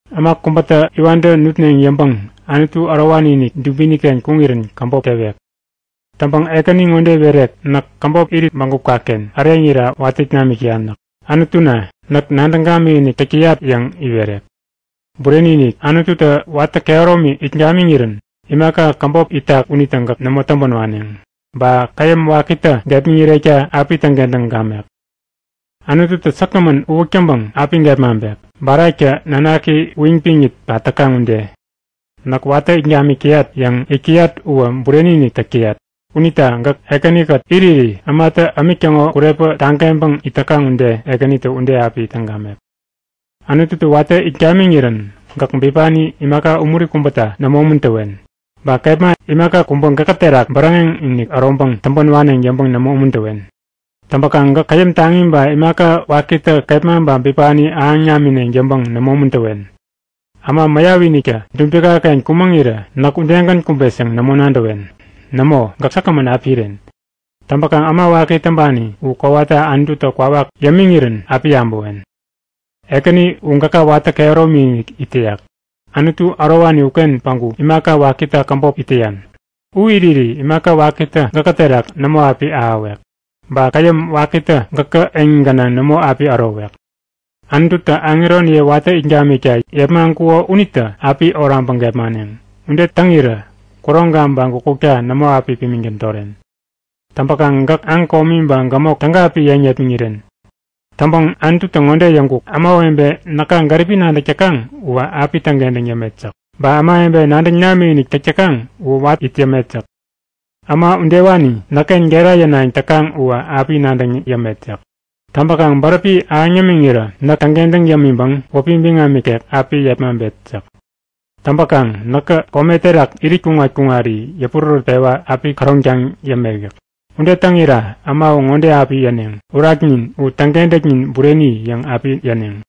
Äma kubätä iwantä nutneŋ yäŋpäŋ Anutu ärowani-inik dubiniken kuŋirän käbop tewek. Täŋpäŋ Ekäni ŋode iwerek; Näk käbop irit bägupkaken äreŋira watä it namik täyan yäk. Anutuna, näk nadäŋ gamikinik täk täyat yäŋ iwerek. Bureni-inik, Anututä watä kehäromi it gamiŋirän, imaka käbop itak unitä gäk nämo täŋpän waneŋ. Ba käyäm wakitä gepmäŋirekta api täŋkentäŋ gamek. Anututä säkgämän uwäk täŋpäŋ api gepmaŋpek, baraktä nanaki uyiŋpiŋit pat täkaŋ ude. Näk watä it gamik täyat yäŋ yäk täyak uwä bureni-inik täk täyak. Unita gäk Ekänikät iriri ämatä ämik täŋo kurepä tageŋpäŋ it täkaŋ ude Ekänitä ude api täŋ gamek. Anututä watä it gamiŋirän gäk bipani imaka umuri kubäta nämo umuntäwen. Ba kepma imaka kubä gäkä terak bäräŋeŋ-inik äroŋpäŋ täŋpän waneŋ yäŋpäŋ nämo umuntäwen. Täŋpäkaŋ gäk käyäm taŋi ba imaka wakitä kepma ba bipani ahäŋ namineŋ yäŋpäŋ nämo umuntäwen. Äma mäyapiniktä dubikaken kumäŋirä näk udegän kumbet yäŋ nämo nadäwen. Nämo! Gäk säkgämän api iren. Täŋpäkaŋ äma waki täŋpani u kowata Anututä kwawak yämiŋirän api yabäwen. Ekäni u gäka watä kehäromi-inik it täyak. Anutu ärowani uken päŋku imaka wakita käbop it täyan. U iriri imaka wakitä gäkä terak nämo api ahäwek. Ba käyäm wakitä gäkä eŋi gänaŋ nämo api ärowek. Anututä aŋeroniye watä it gamikta yepmaŋkuko unitä api oraŋpäŋ gepmaneŋ. Ude täŋirä kuroŋka ba gukutka nämo api pimiŋ tädoren. Täŋpäkaŋ gäk aŋ komi ba gämok täga api yeŋ yepmäŋiren. Täŋpäŋ Anututä ŋode yäŋkuk; Ämawebe näka gäripi nadäk täkaŋ uwä api täŋkentäŋ yämet yäk. Ba ämawebe nadäŋ namikinik täk täkaŋ uwä watä it yämet yäk. Äma udewani näkken gera yänayäŋ täkaŋ uwä api nadäŋ yämet yäk. Täŋpäkaŋ bäräpi ahäŋ yämiŋirä näk täŋkentäŋ yämiŋpäŋ wäpi biŋam ikek api yepmaŋpet yäk. Täŋpäkaŋ näkä kome terak irit kuŋat-kuŋari yäpurärät-pewa api käroŋtaŋ yämek yäk. Ude täŋira äma u ŋode api yäneŋ; Uraknin u täŋkentäknin bureni yäŋ api yäneŋ.